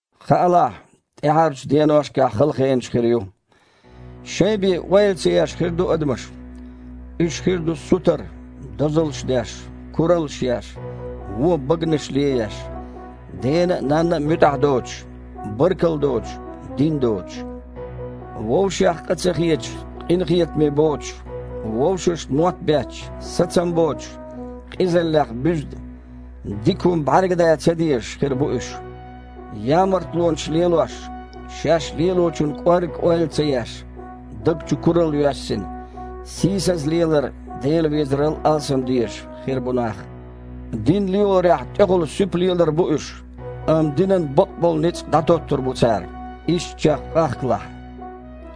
Хаалахь, тІаьхьарчу деношкахь хала хенаш хир ю. Шайн бен ойла ца еш хир ду адамаш. Уьш хир ду сутара, дозаллаш деш, кураллаш еш, вон баганаш лееш, дена а, нанна а муьтІахь доцуш, баркалла доцуш, дин доцуш. Вовшех къа ца хеташ, къинхетаме боцуш, вовшашна мотт бетташ, сацам боцуш, къизаллех буьзна, дика хІума бІаьрга дан ца дезаш хир бу уьш. Ямартлонаш лелош, шаьш лелочун кІоргга ойла ца еш, даг чу куралла йоьссина, сийсаза лелар Дела везарал алсам дезаш хир бу нах. Дин лелорехь тІехула суьпа лелар бу уьш, амма динан бакъболу ницкъ дІатоттур бу цара. Ишттачех къахкалахь.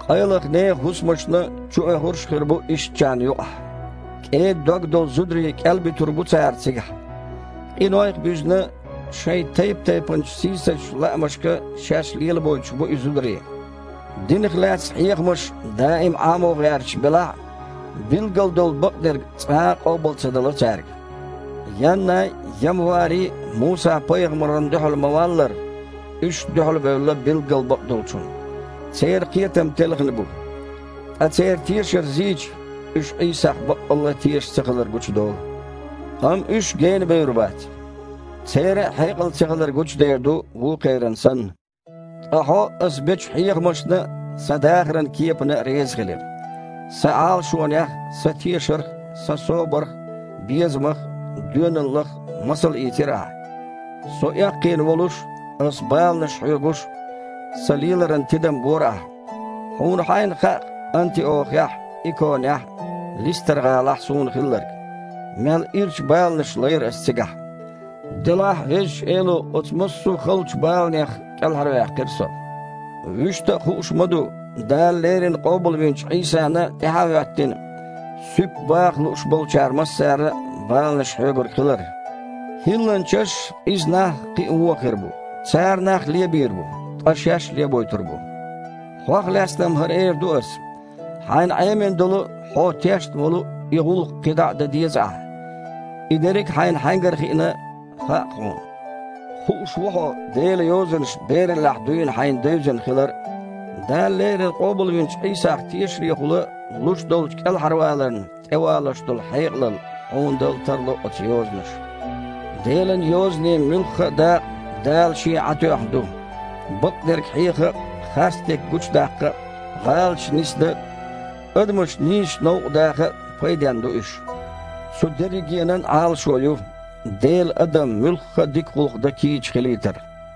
Къайлаха нехан хІусамашна чуоьхурш а хир бу ишттачарна юкъахь. КІеда дог долу зударий кІелбуьтур бу цара цигахь. Къинойх а буьзна, шайн тайп-тайпанчу сийсазчу лаамашка шаьш лелабойтуш бу и зударий. Динах лаьцна хьехамаш даим Іамо гІерташ белахь а, билггал долу бакъдерг цкъа а къобал ца дало цаьрга. Яннай а, Ямвари а Муса-пайхамарна дуьхьал ма-валлара, уьш а дуьхьалбевлла билггал бакъдолчунна. Церан кхетам телхина бу, ткъа церан тешар зийча, уьш Іийсах баккъалла а тешаш ца хилар гучудолу. Амма уьш гена бевр бац. Церан а хьекъал цахилар гучудер ду, вукхеран санна. Ткъа хьо аса бечу хьехамашна а, сан дахаран кепана а резахилира. Сан Іалашонех а, сан тешарх а, сан собарх а, безамах а, доьналлах а масал ийцира ахь. Со эккхийна волуш а, ас баланаш хьоьгуш а сан леларан тидам бора ахьа. Хьуна хьайна хаьа-кх Антиохехь а, Иконехь а, Листар-гІалахь а суна хилларг. Мел ирча баланаш лайра аса цигахь. Делахь а Везачу Эло оцу массо а халачу баланех кІелхьарваьккхира со. Вуьшта а хууш ма ду, Дала леррина къобалвинчу Іийсана тІаьхьа а хІоьттина, суьпа баха лууш болчара массара а баланаш хьоьгург хилар. ХІилланчаш а, къиза нах а кхин а вон хир бу. Цара нах лебийр бу, ткъа шаьш а лебойтур бу. Хьох лаьцна-м хІара эр ду ас: хьайна Іемина долу а, хьо тешна волу а и гІуллакх кхидІа а дан деза ахьа. И дерриг а хьайна хьаьнгара хиъна хаьа-кх хьуна. Хууш ву хьо Делан Йозанаш бераллехь дуьйна хьайна девзина хилар а. Дала леррина къобалвинчу Іийсах тешарехула луш долчу кІелхьарваларна тІевалош долу хьекъалалла хьуна дала тарло оцу Йозанаша. Делан Йозанийн муьлхха а дакъа Дала Шен Іаь тоьхна ду. Бакъдерг хьеха а, харцдерг гучудаккха а, гІалаташ нисдан а, адамаш нийсачу новкъа даха а пайденна ду уьш. Цу дерригенан Іалашо ю: Делан адам муьлхха а дика гІуллакх дан кийча хилийтар.